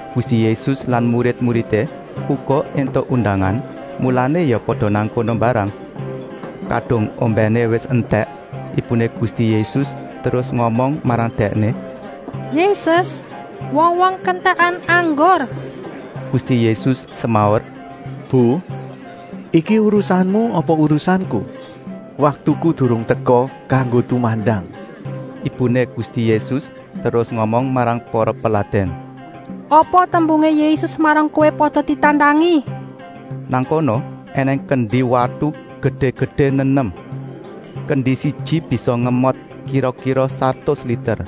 Gusti Yésus lan murid-muridé uga éntuk undangan, mulané ya pada nang kono mbarang. Kadung ombèné wis entèk ibuné Gusti Yésus terus ngomong marang Dèkné: “Yésus, wong-wong kentèkan anggur.” Gusti Yésus semaur: “Bu, iki urusanmu apa urusanku. Waktuku durung teka kanggo tumandang.” Ibuné Gusti Yésus terus ngomong marang para peladèn: “Apa tembungé Yésus marang kowé pada ditandangi.” Nang kono ènèng kendi watu gedé-gedé nenem. Kendi siji bisa ngemot kira-kira satus liter.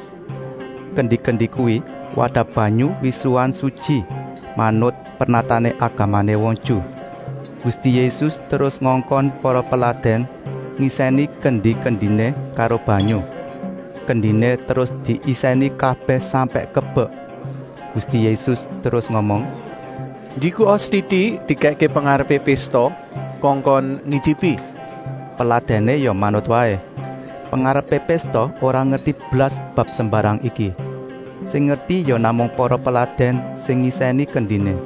Kendi-kendi kuwi wadah banyu wisuhan sutyi, manut pernatané agamané wong Ju. Gusti Yésus terus ngongkon para peladèn ngisèni kendi-kendiné karo banyu. Kendiné terus diisèni kabèh sampèk kebek. Gusti Yésus terus ngomong: “Njikuka setitik dikèkké pengarepé pésta kongkon ngityipi!” Peladèné ya manut waé. Pengarepé pésta ora ngerti blas bab sembarang iki. Sing ngerti ya namung para peladèn sing ngisèni kendiné.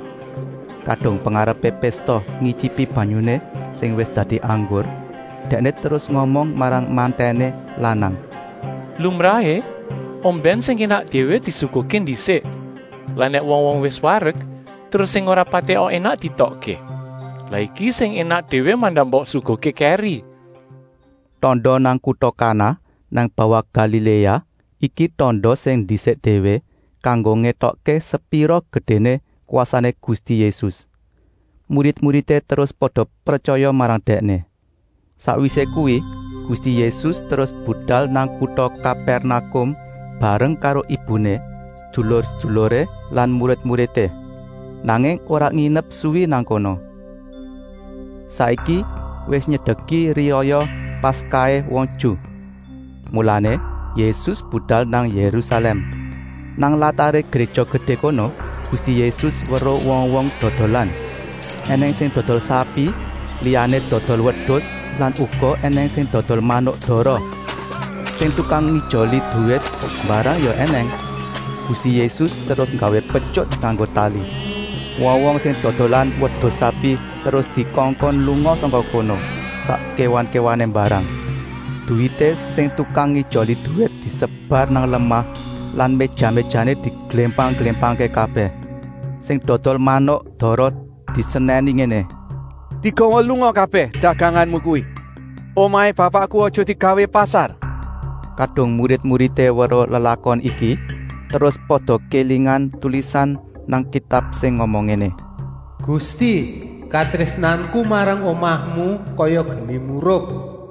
Kadung pengarepé pésta ngityipi banyuné sing wis dadi anggur, dèkné terus ngomong marang mantèné lanang: “Lumrahé ombèn sing énak déwé disuguhké ndisik, lah nèk wong-wong wis warek terus sing ora patèka énak dietokké. Lah iki sing énak déwé mandak mbok suguhké kèri!” Tanda nang kuta Kana nang bawah Galiléa iki tanda sing ndisik déwé, kanggo ngétokké sepira gedéné kwasané Gusti Yésus. Murid-muridé terus pada pretyaya marang Dèkné. Sakwisé kuwi Gusti Yésus terus budal nang kuta Kapèrnakum, bareng karo ibuné, sedulur-seduluré lan murid-muridé. Nanging ora nginep suwi nang kono. Saiki wis nyedeki riyaya Paskahé wong Ju. Mulané Yésus budal nang Yérusalèm. Nang lataré Gréja Gedé kono Gusti Yésus weruh wong-wong dodolan. Enèng sing dodol sapi, liyané dodol wedus lan uga ènèng sing dodol manuk dara. Sing tukang ngijoli duwit mbarang ya ènèng. Gusti Yésus terus nggawé petyut nganggo tali. Wong-wong sing dodolan wedus-sapi terus dikongkon lunga sangka kono, sak kéwan-kéwané mbarang. Duwité sing tukang ngijoli duwit disebar nang lemah lan méja-méjané diglémpang-glémpangké kabèh. Sing dodol manuk dara disenèni ngéné: “Digawa lunga kabèh daganganmu kuwi! Omahé Bapakku aja digawé pasar!” Kadung murid-muridé weruh lelakon iki, terus pada kélingan tulisan nang Kitab sing ngomong ngéné: “Gusti, katrésnanku marang omahmu kaya geni murup.”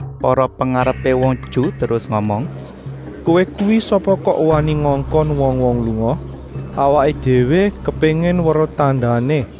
Para pengarepé wong Ju terus ngomong: “Kowé kuwi sapa kok wani ngongkon wong-wong lunga? Awaké déwé kepéngin weruh tandané.”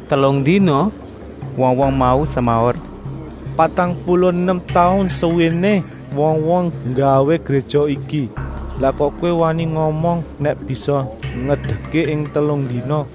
“Telung dina?” wong-wong mau semaur. “Patang puluh nem taun suwéné wong-wong nggawé Gréja iki, lah Kowé kok wani ngomong nèk bisa ngedekké ing telung dina?”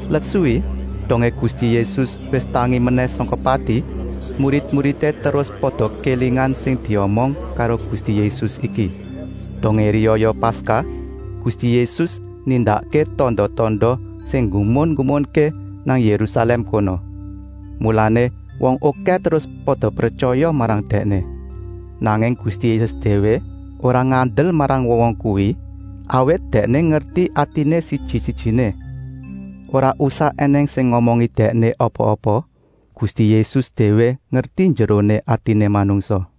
Let suwi, dongé Gusti Yésus wis tangi menèh sangka pati, murid-muridé terus pada kélingan sing diomong karo Gusti Yésus iki. Dongé riyaya Paskah Gusti Yésus nindakké tanda-tanda sing nggumun-nggumunké nang Yérusalèm kono. Mulané wong okèh terus pada pretyaya marang Dèkné. Nanging Gusti Yésus déwé ora ngandel marang wong-wong kuwi, awit Dèkné ngerti atiné siji-sijiné. Ora usah ènèng sing ngomongi Dèkné apa-apa, Gusti Yésus déwé ngerti njeroné atiné manungsa.